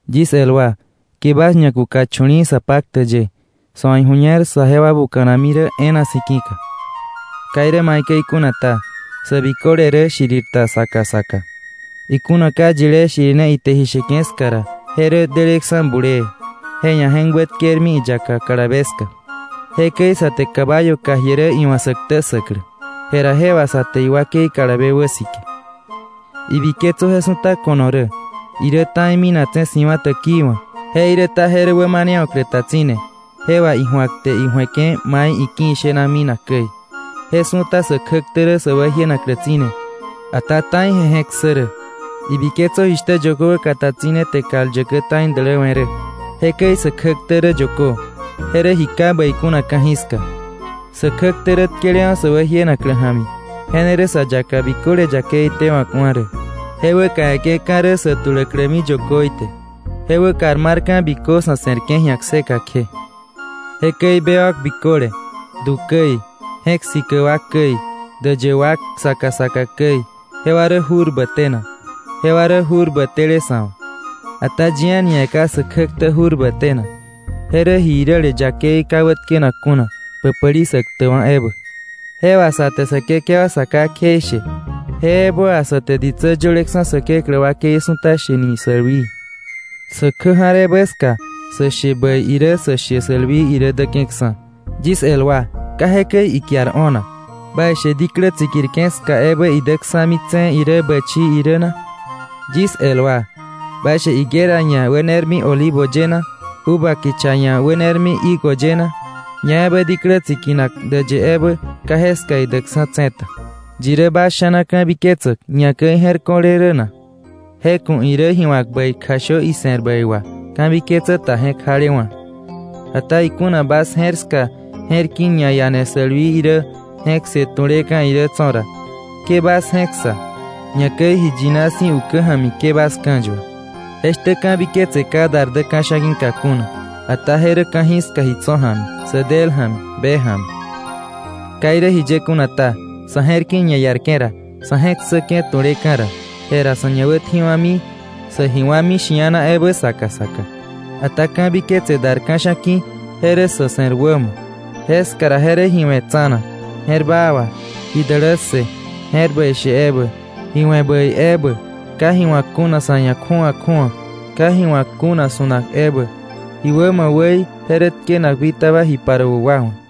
Yis el wa, ke bas ñakuka chu̱li̱i̱ sa paktäk ye, sa̱ wa̱ iju̱ñer saje wa buka̱nami e̱e̱na si̱ ki̱ka. Ka irä maikäi kuna ta, sä biköle rä shirir ta saka saka. Ikuna ka yilé shirine ite ji sheke̱ ska ra, je rä deleksa̱ bulee, je ia̱ je̱k wätkermi iyaka kalabe ska. Jekäi sa te caballo kà jie rä iwa̱ sä ktä ssäklä, je ra je wà sa te iwakei kalabe wäsike. Ibiketsö, je su̱ta ko̱no rä, irä ta̱i minaktse̱ si̱wa̱ täkii wa̱. Jeiräta je rä wämanewa̱klä ta tsi̱ne, je wà iju̱ak te iju̱eke̱ mai iki̱ ishena minak käi. Je su̱ta sä kjäktä rä sä wäjienaklä tsi̱ne, ata ta̱i je je̱k ssä rä. ¡Ibiketsö, jishtä yökö wäkata tsi̱ne te kal yäkä ta̱i däläwe̱ rä! Jekäi sä kjäktä rä yökö, je rä ji yakei ka̱jiska. Sä kjäktä rä tkelewa̱ sä wäjienaklä ja̱mi, je ne rä sa yaka biköle yakei tewa̱kwa̱ rä. Je wäkawe̱ke̱ka̱ rä sä tuläklämi yököí te. Je wäkar marka̱ bikö sa̱ se̱rke̱ ji̱a kseka kje. Jekäi bewak biköle du käi, je̱k sikäk wa käi, däyë wak saka saka käi, jewa rä jurbä tenak, je rä jurbä tele sa̱ wa̱. Ata yi a̱ni ia̱ ka sä kjäktä jurbä tenak. Je rä ji iräle yakei ka wätkenak kuna, päpäli sä ktäkwa̱ ebä. Je wà sa te Säkekewa Sa Ká kjeishe, je ebä wà sä te ditsä yöleksa̱ Säkeklä wakei su̱ta shene yakei. Sä kjä ja̱r ebä ska, sä she bäi irä, sä she yakei irä däke̱ksa̱. Yis el wa, ka jekäi ikiar o̱nak. ¿Baishe diklä tsikirke̱ ska ebä, idäksa̱mi tse̱e̱ irä bächii irä na? Yis el wa: ¿Baishe higuera ia̱ wänermi olivo ye na, uva kicha ia̱ wänermi higo ye na? Ñaebä diklä tsikinak däyë ebä, ka jeska idäkksa̱ tse̱ ta. ¿Yi rä bas sha̱na ka̱biketsäk, ñakäi je̱r ko̱le rä na? Je ku̱ irä ji wa̱k bäi kjashö ise̱r bäi wà, ka̱biketsä ta je̱k jalewa̱. Ata ikuna bas je̱r ska, je̱r ki̱ ñaiane sälwii irä, je̱k ssë tu̱leka̱ irä tso̱ ra, ke bas je̱k ssa, ñakäi ji yina si̱ ukä ja̱mi ke bas ka̱yua. Jeshtä ka̱biketse ka dar dä ka̱sha̱ ki̱ka kuna, ata je rä ka̱jiska ji tso̱ ja̱mi, sä del ja̱mi, be ja̱mi. Ka irä jiye kuna ta, sa̱ je̱r ki̱ ñaiarke̱ ra, sa̱ je̱k ssäke̱ tu̱leka̱ ra, jera sa̱ ñawätji̱wa̱mi, sä ji wa̱mi shia̱na ebä saka saka. Ata ka̱biketse dar ka̱sha̱ ki̱, je rä sa̱ se̱r wämo, jeska ra je rä ji we̱ tsa̱na, je̱r baa wà, ji dälässë, je̱r bäi she ebä, ji we̱ bäi ebä, ka ji wa̱k kuna sa̱ ia̱ kju̱awa kju̱awa, ka ji wa̱k kuna su̱nak ebä. Ji wämo wäí je rä tkenak bitaba ji paruäk wa wa̱.